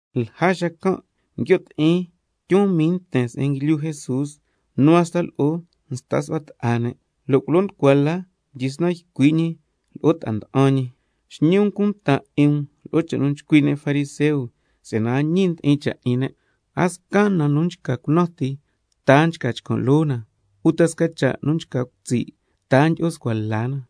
Lja xacan' nguio' ti'in tyun mii nten se'en nguilyu Jesús, nu hasta lo'o nsta su'hua ta'a ne', lo' culo nducua la mdyisnan ycui' ñi lo'o yu ta'a nda'an ñi: Xñi um cunta 'in um lo'o cha' nu nchcui' ne' fariseo, si'yana a ñi ndi'in cha' 'in ne'. A sca na nu nchca cunan ti, ta a chcan' loo na, uta sca cha' nu nchca cutsi', ta a tyi'o scua la na.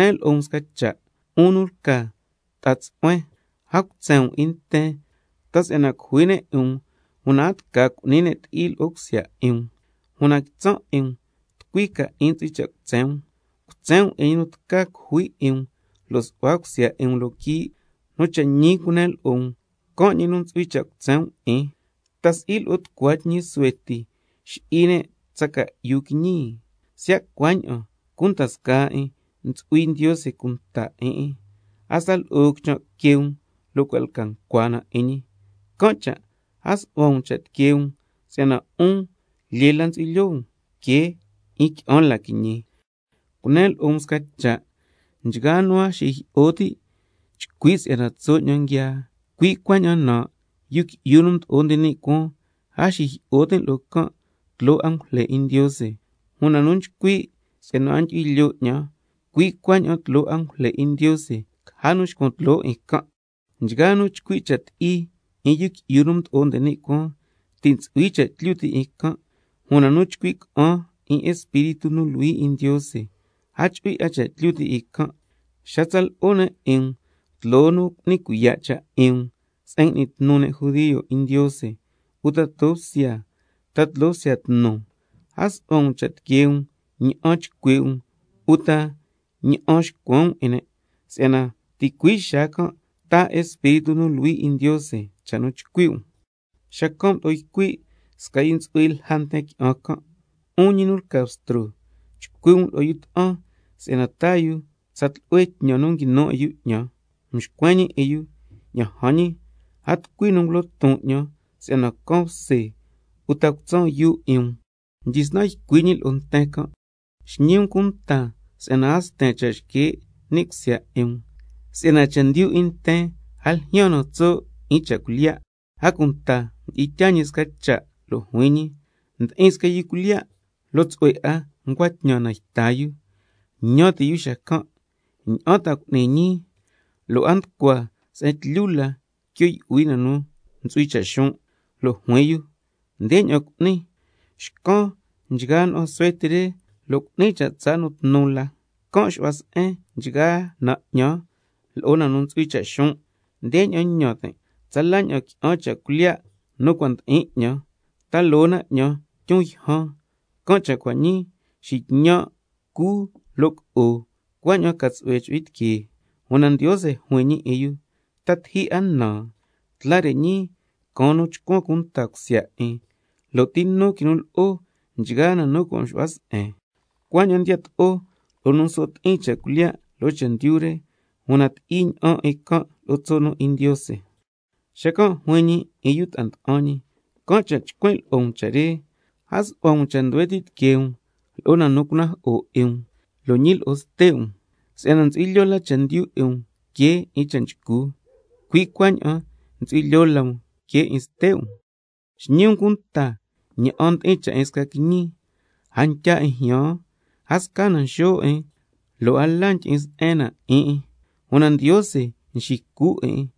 Cunen lo'o um sca cha', 'un nu lca ta'a tsu'huen: A cutsen um 'in nten ta si'yana cujui ne' 'in um una a tca cu'ni ne' ti'i lo'o cusya 'in um. Una quitsan' 'in um tucui ca 'in ntsu'hui cha' cutsen um: Cutsen um 'in ñi nu tca cujui 'in um lo' su'hua cusya 'in um loo quii', nu cha' ñi cunen lo'o um, can' ñi nu ntsu'hui cha' cutsen um 'in. ¿Ta si'i lo'o tucua tñi suhue ti nxi'i ne' tsa ca'yu quiñi? Siya' cuaña'an, cunda scaa 'in ntsu'hui Ndiose cunta 'in 'in. Hasta lo'o quichan' que um, cua' lca ncua na 'in ñi. Can' cha' a su'hua um cha' tiquee um, si'yana 'un lyee la ntsu'hui lyoo um que 'in qui'an la quiñi. Cunen lo'o um sca cha', nchgaa nu a nxijyi'o ti' chcui' si'yana tso' 'ñan nguiaa, cui' cuaña'an nan', Yu Qui'yu nu Mdo'o nde ni' Cuaan, a xijyi'o tin' lo'o can' tloo angujle 'in Ndiose. Una nu nchcui' si'yana a ndyu'hui lyoo 'ñan, cui' cuaña'an tloo angujle 'in Ndiose caja nu xcuan tloo 'in can'. Nchgaa nu chcui' cha' ti'i 'in Yu Qui'yu nu Mdo'o nde ni' Cuaan, ti' ntsu'hui cha' tlyu ti' 'in can', una nu chcui' ca'an 'in Espíritu nu Luhui 'in Ndiose, a chu'hui 'a cha' tlyu ti' 'in can'. Xa tsa lo'o ne' 'in um tloo nu cu'ni cuiya' cha' 'in um se'en ngui'ni tnu ne' judio 'in Ndiose, uta tloo bsya, ta tloo bsya tnu, a su'hua um cha' tiquee um ña'an chcui' um uta ña'an xcuen um 'in ne', si'yana ticui' xaa can' taa Espíritu nu Luhui 'in Ndiose cha' nu chcui' um. Xacan' mdo'o ycui' sca nu ntsu'hui lja nten qui'an can': 'Un ñi nu lca Bstro, chcui' um lo'o yu ta'an si'yana taa yu tsa tlu'hue tñan nu nguinu 'in yu 'ñan. Mxcuen ñi 'in yu: Ña'an jan ñi, a tucui nu ngulo ton 'ñan si'yana can bse lo' cutsan yuu 'in um. Mdyisnan ycui' ñi lo'o nten can': Xñi um cunta si'yana a sten scasca cha' xque' ni' cusya 'in um, si'yana chendyu 'in nten a ljyaan na tso' 'in cha' cuilyiya'. A cunta mdi'in tyaa ñi sca cha' lo' juin ñi: Ndi'in sca yu cuilyiya', lo' tsu'hue 'a ncua tñan na nu yta yu. Ñan ti' yu xacan': ¿Ña'an ta ca ñii, lo' a nducua se'en tlyu la quio' yu'hui na nu ntsu'hui cha' xon'? Lo' juin yu: Ndeña'an cu'nin, xcan nchgaa na'an suhue ti re lo' cu'nin cha' tsaa' nu tnu la, can' xu'hua se'en nchgaa na 'ñan lo'o na nu ntsu'hui cha' xon'. Ndeña'an ñan tin': Tsala ña'an qui'an cha' cuilyiya' nu cua' ndi'in 'ñan, ta loo na 'ñan tyun yjan, can' cha' cua' ñii xitñan', cun lo' co'on, cuaña'an ca tsu'hue chu'hui tiqueen. Una Ndiose juin 'in yu: ¿Ta tiji 'a nan? Tla re ñii caan nu chcuan cunta cusya 'in, ¿lo' ti nu ta quinu lo'o nchgaa na nu cua' mxu'hua se'en? Cuaña'an ndiyato'o lo'o nu nso' ti'in cha' cuilyiya' loo chendyu re, una ti'i ña'an 'in can' lo'o tso' nu 'in Ndiose. Xacan' juin ñi 'in yu ta'a nda'an ñi: Can' cha' nchcuin' lo'o um cha' re: A su'hua um cha' nduhue ti' tiquee um lo'o na nu cunajo'o 'in um, lo' ñi lo'o ste' um. Si'yana ntsu'hui lyoo la chendyu 'in um que 'in cha' nchcu, cui' cuaña'an ntsu'hui lyoo la um que 'in ste' um. Xñi um cunta ña'an ndi'in cha' 'in sca quiñi, a ntya 'in jyaan, a sca na nxo' 'in, lo' a la ndyi'in se'en na 'in 'in, una Ndiose nxicu 'in 'in.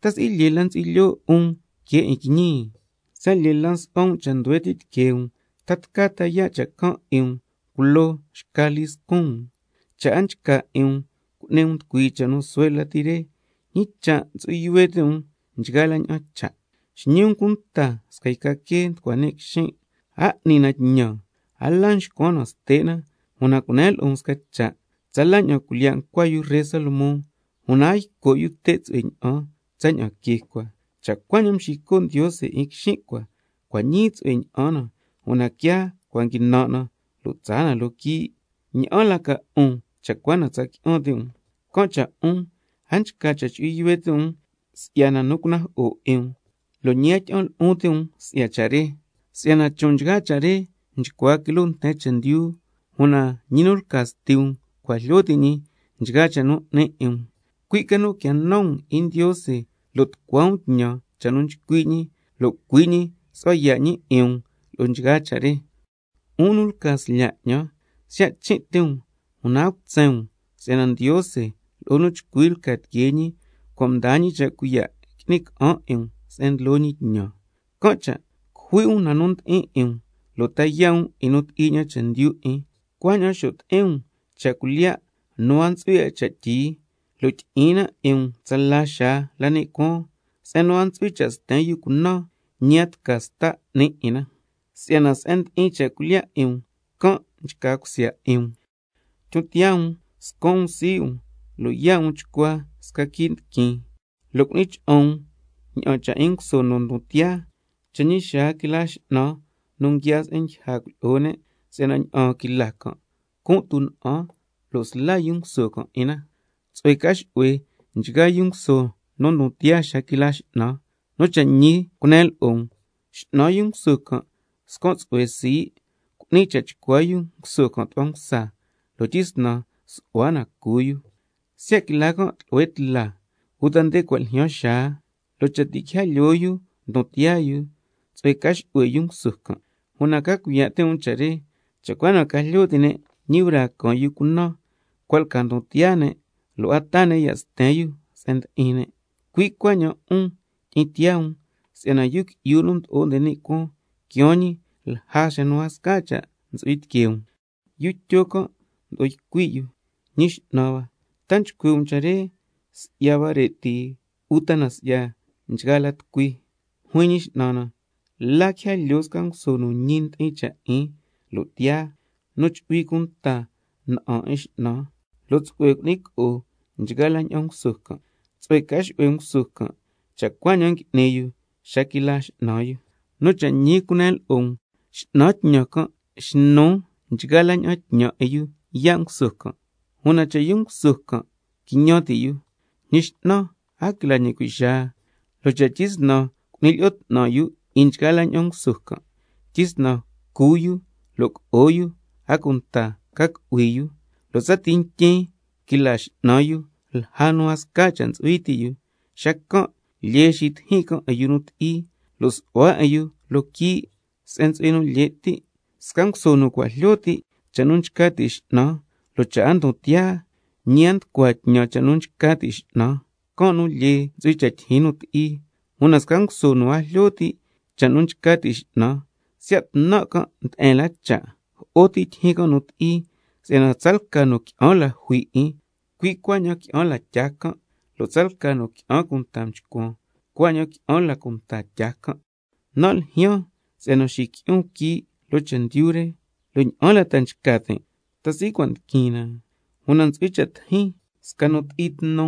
¿Ta si'i lyee la ntsu'hui lyoo um que 'in quiñi? Siya' lyee la nsu'hua um cha' nduhue ti' tiquee um, ¿ta tca ta yaa' cha' can' 'in um culo um xca lii scun um? Cha' a nchca 'in um cu'ni um nducuii cha' nu suhue la re, ¿ñi cha' ntsu'hui yuhue ti' um nchgaa la ña'an cha'? Xñi um cunta sca yca quee nducua ni' quixin', a n'ni na tñan, a la nxcuan ste' na, una cunen lo'o um sca cha', tsala ña'an cuilyiya' ncua yu ree Salomón, una a yco' yu te' tsu'hue ña'an tsaña'an quee cua. Cha' cuaña'an nxico' Ndiose 'in quixin' cua, cua' ñii tsu'hue ña'an na, una quiaa cua' nguinan' na lo' tsaa na loo quii', ¿ña'an la ca 'un, cha' cua na tca tsa qui'an ti' um? Can' cha' 'un a nchca cha' chu'hui yuhue ti' um si'ya na nu cunajo'o 'in um, lo' ñi a tyi'an lu'un ti' um si'ya cha' can'. Si'yana chon' nchgaa cha' re nchcua quiloo nten chendyu, una ñi nu lca Sti um cua' jlyo ti' ñi nchgaa cha' nu 'ni 'in um. Cui' ca nu quia nan um 'in Ndiose lo' tucua um tñan cha' nu nchcui' ñi, lo' cui' ñi su'hua yaa' ñi 'in um lo'o nchgaa cha' re. 'Un nu lca slya' 'ñan, siya' chin' ti um, una a cutsen um si'yana Ndiose lo'o nu chcui lca tiquee ñi cua' mdaa ñi cha' cuiya' qui'ni ca'an 'in um se'en ndlo ñi tñan. Can' cha' cujui' um na nu ndi'in 'in um, lo' ta yaa' um 'in nu ti'i ña'an chendyu 'in, cuaña'an xo' ti'in um cha' cuilyiya' nu a ntsu'hui 'a cha' tyii, lo' tyi'in na 'in um tsala xaa la ni' cuaan, se'en nu a ntsu'hui cha' sten yu cunan, lo' ñi a tca sta 'ni 'in na. Si'yana se'en ndi'in cha' cuilyiya' 'in um, can' nchca cusya 'in um. Tyon tiyaa um, scan' um sii' um lo' yaa' um chcua sca quii' ndiquin, lo' cu'ni cha'an um ña'an cha' 'in nguso nu ndon tiyaa cha' ñi xaa quila x'nan nu nguiaa se'en ndyija cuilyi'o ne', si'yana ña'aan quila can' cun' tuna'an, lo' sla yu nguso can' 'in na. Tsu'hue ca xu'hue nchgaa yu nguso nu ndon tiyaa xa quila x'nan. Nu cha' ñi cunen lo'o um, x'nan yu nguso can' scan' tsu'hue sii', cu'ni cha' chcua yu nguso can' tu'hua msa, lo' tyisnan su'hua na cu yu. Siya' quila can' tlu'hue tla uta nde cua' ljyaan xaa, lo' cha' ti' quija lyoo yu ndon tiyaa yu, tsu'hue ca xu'hue yu nguso can'. Una ca cuiya' ti' um cha' re: Cha' cua na ca jlyo ti' ne' ñi braa caan yu cunan, cua' lca ndon tiyaa ne', lo' a taa ne' ya' sten yu se'en ndi'in ne'. Cui' cuaña'an 'un, tyi'in tiyaa um, si'yana Yu Qui'yu nu Mdo'o nde ni' Cuaan quiaan ñi lja nu a sca cha' ntsu'hui tiquee um. Yu Tyo can' mdo'o ycui' yu: Ñi X'nan hua, ¿ta ycui' um cha' re si'ya huare' ti, uta si'ya nchgaa la tucui? Juin Ñi X'nan na: ¿La quija lyoo sca nguso nu ñi ndi'in cha' 'in lo' tiyaa, nu chu'hui cunta na'an 'in x'nan, lo' tsu'hue cu'ni co'o nchgaa la ña'an nguso can'? Tsu'hue ca xu'hue nguso can' cha' cuaña'an ngui'ni yu xa quila x'nan yu. Nu cha' ñi cunen lo'o um, x'nan tñan can' xnu nchgaa la ña'an tñan 'in yu yaa' nguso can'. Una cha' yu nguso can' quiñan ti' yu: Ñi x'nan a quila ñi cui' xaa. Lo' cha' tyisnan cu'ni lyi'o 'tnan 'in nchgaa nguso can', tyisnan cu yu lo' co'o yu, a cunta ca cu'hui yu, lo' tsati ntyin quila x'nan yu lja nu a sca cha' ntsu'hui ti' yu, xacan' lyee xitijin can' 'in yu nu ti'i, lo' su'hua 'in yu loo quii' se'en ntsu'hui nu lye' ti'. Sca nguso nu cua' jlyo ti' cha' nu nchca ti' x'nan, lo' cha' a ndon tiyaa, ñi a nducua tñan cha' nu nchca ti' x'nan, can' nu lyee ntsu'hui cha' tyijyin nu ti'i. Una sca nguso nu a jlyo ti' cha' nu nchca ti' x'nan, siya' tnan' can' nde'en la cha', jo'o ti tyijyin can' nu ti'i, si'yana tsalca nu qui'an la jui 'in, cui' cuaña'an qui'an la tyaa can', lo' tsalca nu qui'an cunta mchcuan, cuaña'an qui'an la cunta tyaa can'. Nan' ljyaan si'yana xiqui'on quii' loo chendyu re, ¿lo' ña'an la ta nchca tin', ta si'i cua' ndiquin na? Una ntsu'hui cha' tijin sca nu ti'i tnu,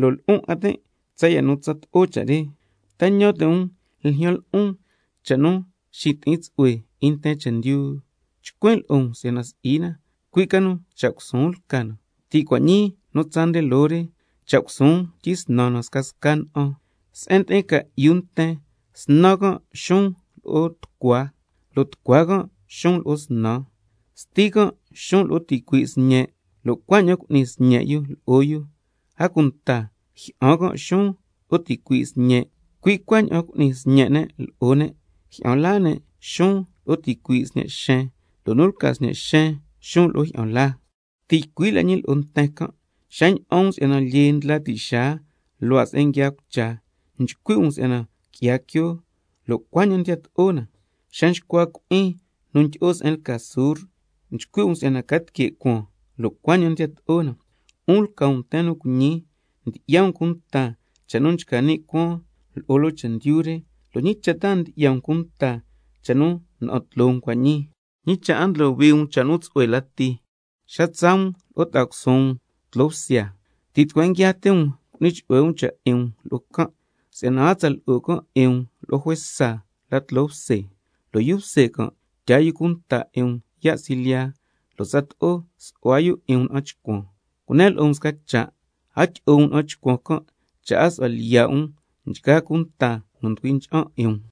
lo' lu'un 'a tin' tsaya' nu tsato'o cha' re. ¿Ta ñan ti' um ljyan lo'on cha' tsu'hue nu xiti'in tsu'hue 'in nten chendyu? Chcuin' lo'o um si'yana si'i na, cui' ca nu cha' cusuun lca na. Ti' cua' ñii nu tsaa nde loo re, cha' cusuun tyisnan scasca na'an. Se'en ndi'in ca'yu nten, snan can' xuun lo'o tucua, lo' tucua can' xuun lo'o snan. —Sti can' xuun lo'o ticui' sñe', lo' cuaña'an cu'ni sñe' yu lo'o yu, a cunta jyi'an can' xuun lo'o ticui' sñe', cui' cuaña'an cu'ni sñe' ne' lo'o ne', jyi'an laa ne' xuun lo'o ticui' sñe' xen, lo' nu lca xen can' xuun lo'o jyi'an laa—. Ti' ycui' la ñi lo'o nten can': Xa ña'an um si'yana lyee ndla ti' xaa luhua' se'en nguiaa cucha, nchcui' um si'yana qui'ya quio, lo' cuaña'an ndiyato'o na. Xa nxcua cui'in nu ndyi'o se'en lca sur, nchcui' um si'yana ca tique' cuaan, lo' cuaña'an ndiyato'o na. ¡'Un lca um nten nu cuiñi! Ndyi'ya um cunta cha' nu nchca ni' cuaan lo'o loo chendyu re, ¿lo' ñi cha' ta a ndyi'ya um cunta cha' nu na'an tloo um cua' ñii? ¿Ñi cha' a ndlohui um cha' nu tsu'hue lati? Xa tsaa um lo'o ta'a cusuun um tloo bsya, ti' tucueen nguiaa ti um cu'ni chu'hue um cha' 'in um lo'o can', si'yana a tsa lo'o can' 'in um lo'o juesa la tloo bse, lo' yu bse can' tyaa yu cunta 'in um yaa' silyiya, lo' tsato'o su'hua yu 'in um na'an chcuan. Cunen lo'o um sca cha', a tyi'o um na'an chcuan can' cha' a su'hua lyiya' um nchgaa cunta nu nducui ncha'an 'in um.